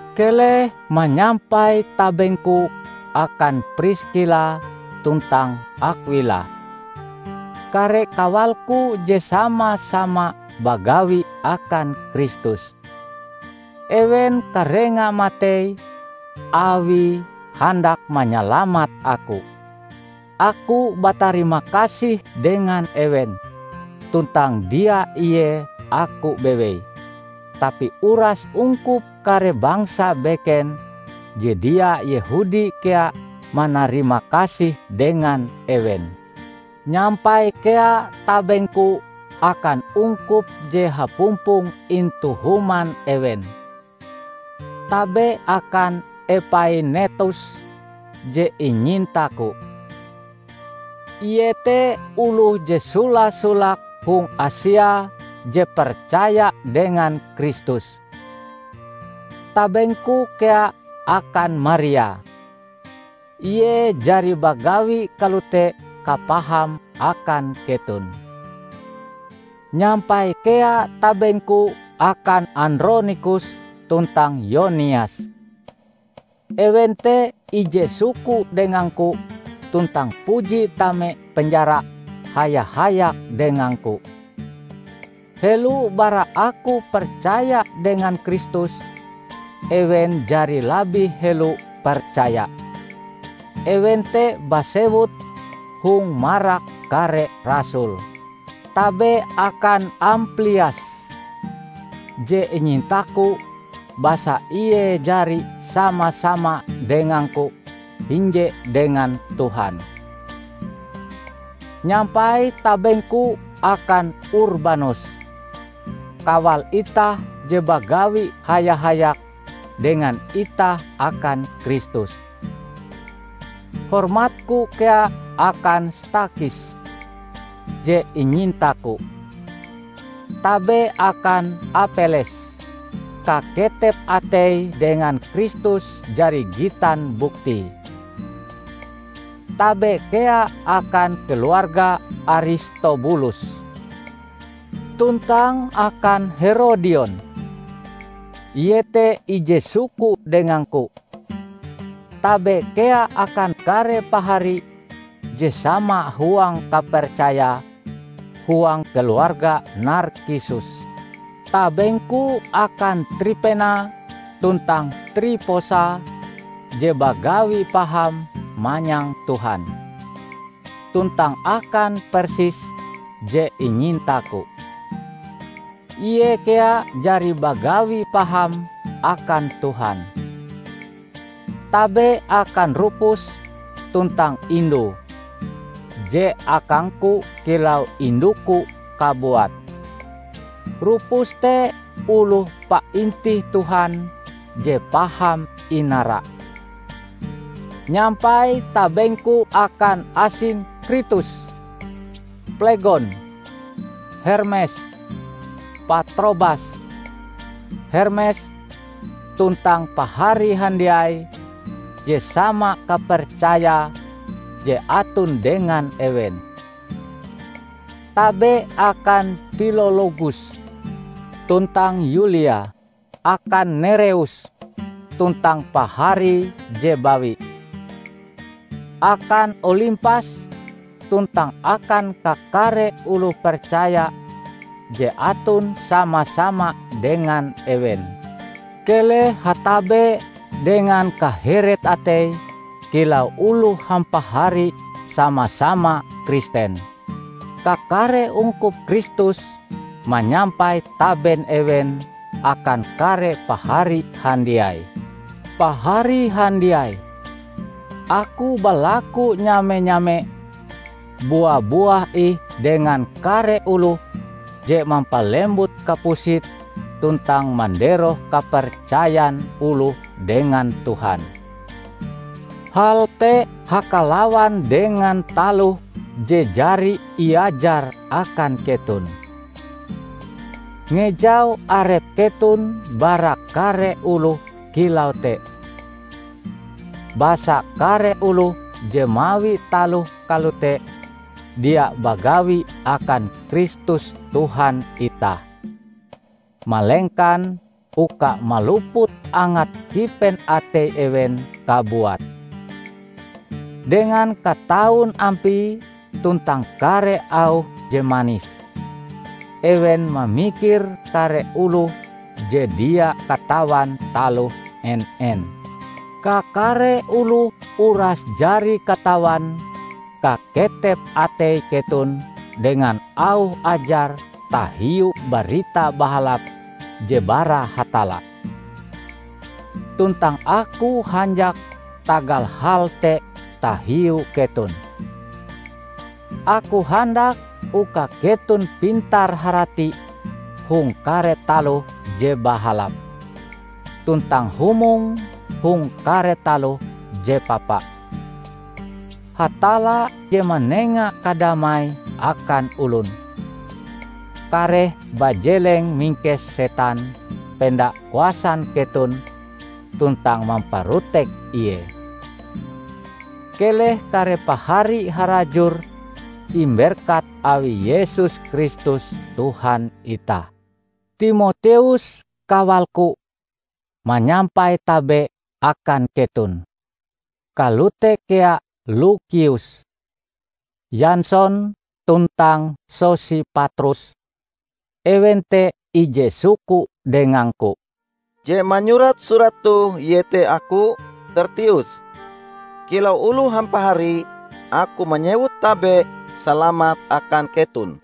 Keleh manyampai tabengku akan Priskila tuntang Akwila, kare kawalku je sama-sama bagawi akan Kristus. Ewen karenga matei awie handak manyalamat aku. Aku batarimakasih dengan ewen -- tuntang dia ie aku bewei, tapi uras ungkup kare bangsa beken je dia Yehudi kea manarimakasih dengan ewen. Nyampai kea tabengku akan ungkup je hapumpong intu human ewen. Tabe akan Epainetos je inyintaku. Ie te oloh je sola-solake hong Asia je percaya dengan Kristus. Tabengku kea akan Maria. Ie jari bagawi kalote kapahame akan keton. Nyampai kea tabengku akan Andronikus tuntang Yonias. Ewen te ije suku dengangku tuntang puji tame penjara haya-hayak dengangku. Helo bara aku percaya dengan Kristus, ewen jari labih helo percaya. Ewen te basewut hong marak kare rasul. Tabe akan Amplias, je inyintaku basa ie jari sama-sama dengangku hinje dengan Tuhan. Nyampai tabengku akan Urbanus, kawal itah je bagawi haya-hayak dengan itah akan Kristus. Hormatku kea akan Stakhis je inyintaku. Tabe akan Apeles. Kaketep ateie dengan Kristus jari gitan buktie. Tabe kea akan keluarga Aristobulus, tuntang akan Herodion. Ie te ije suku dengangku. Tabe kea akan kare pahari je sama huang kapercaya huang keluarga Narkisus. Tabengku akan Tripena tuntang Triposa je bagawi paham manyang Tuhan, tuntang akan Persis je inyintaku. Ie kea jari bagawi paham akan Tuhan. Tabe akan Rupus tuntang indue, je akangku kilau induku kabuat. Rupus te oloh paintih Tuhan je paham inara. Nyampai tabengku akan Asinkritus, Plegon, Hermes, Patrobas, Hermes, tuntang pahari handiai je sama kapercaya je aton dengan ewen. Tabe akan Pilologus tuntang Yulia; akan Nereus tuntang paharie je bawi; akan Olimpas tuntang akan kakare oloh percaya je aton sama-sama dengan ewen. Keleh hatabe dengan kaheret atei kilau oloh hampahari sama-sama Kristen. Kakare ungkup Kristus manyampai taben ewen akan kare pahari handiai. Pahari handiai! Aku balaku nyame-nyame: bua-buah ih dengan kare oloh je mampalembut kapusit tuntang manderoh kapercayan oloh dengan Tuhan. Hal te hakalawan dengan taloh je jari iajar akan keton. Ngejau arep keton bara kare oloh kilau te. Basa kare oloh je mawi taloh kalote dia bagawi akan Kristus Tuhan itah, malengkan uka maluput angat kipen atei ewen kabuat. Dengan kataun ampie tuntang kare auh je manis, ewen mamikir kare oloh je dia katawan taloh en-en. Kakare oloh uras jari katawan kaketep atei keton dengan auh ajar tahiu Barita Bahalap je bara Hatalla. Tuntang aku hanjak tagal hal te tahiu keton. Aku handak uka keton pintar-harati hong kare taloh je bahalap, tuntang humong hong kare taloh je papa. Hatalla je manenga kadamai akan olon, kareh bajeleng mingkes setan penda kuasan keton tuntang mamparotek ie. Keleh kare pahari harajur imberkat awi Yesus Kristus Tuhan itah! Timoteus, kawalku, manyampai tabe akan keton. Kalote kea Lukius, Yanson tuntang Sosipatrus, ewen te ije suku dengangku. Je manyurat surat toh iete aku, Tertius. Kilau oloh hampahari aku manyewut tabe salamat akan keton.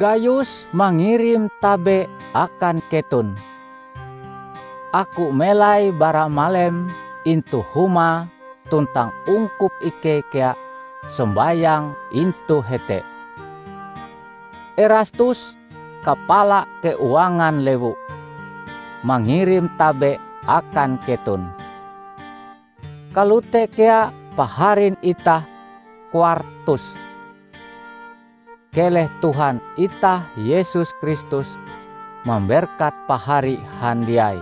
Gayus mangirim tabe akan keton. Aku melai baramalem intu humae tuntang ungkup ikei kea sombayang intu hete. Erastus, kapala keuangan lewu, mangirim tabe akan keton. Kalote kea paharin itah Kwartus. [ Keleh Tuhan itah Yesus Kristus mamberkat pahari handiai.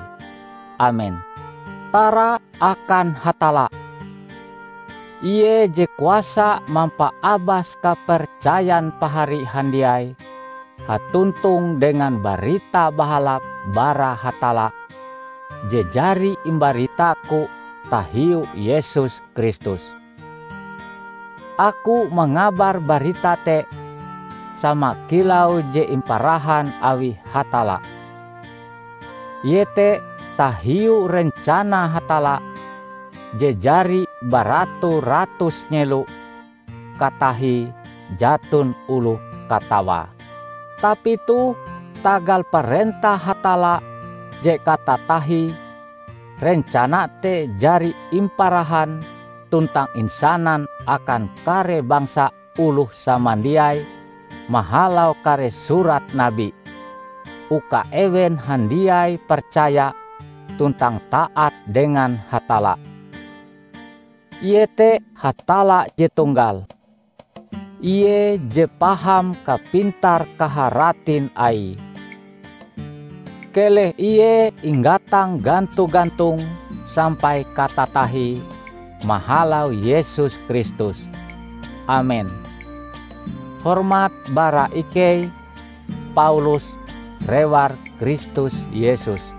Amen.] Tara akan Hatalla! Ie je kuasa mampaabas kapercayan pahari handiai hatontong dengan Barita Bahalap bara Hatalla je jari imbaritaku tahiu Yesus Kristus. Aku mangabar barita te sama kilau je imparahan awi Hatalla; iete tahiu rencana Hatalla je jari baratu-ratus nyelo katahie jaton oloh katawae. Tapi toh, tagal parentah Hatalla je katatahie, rencana te jari imparahan tuntang insanan akan kare bangsa oloh samandiai mahalau kare surat nabi, uka ewen handiai percaya tuntang taat dengan Hatalla. Ie te Hatalla je tunggal, Ie je paham kapintar-kaharatin Aie. Keleh Ie inggatang ganto-gantong sampai katatahie mahalau Yesus Kristus! Amen. Hormat bara ikei, Paulus, rewar Kristus Yesus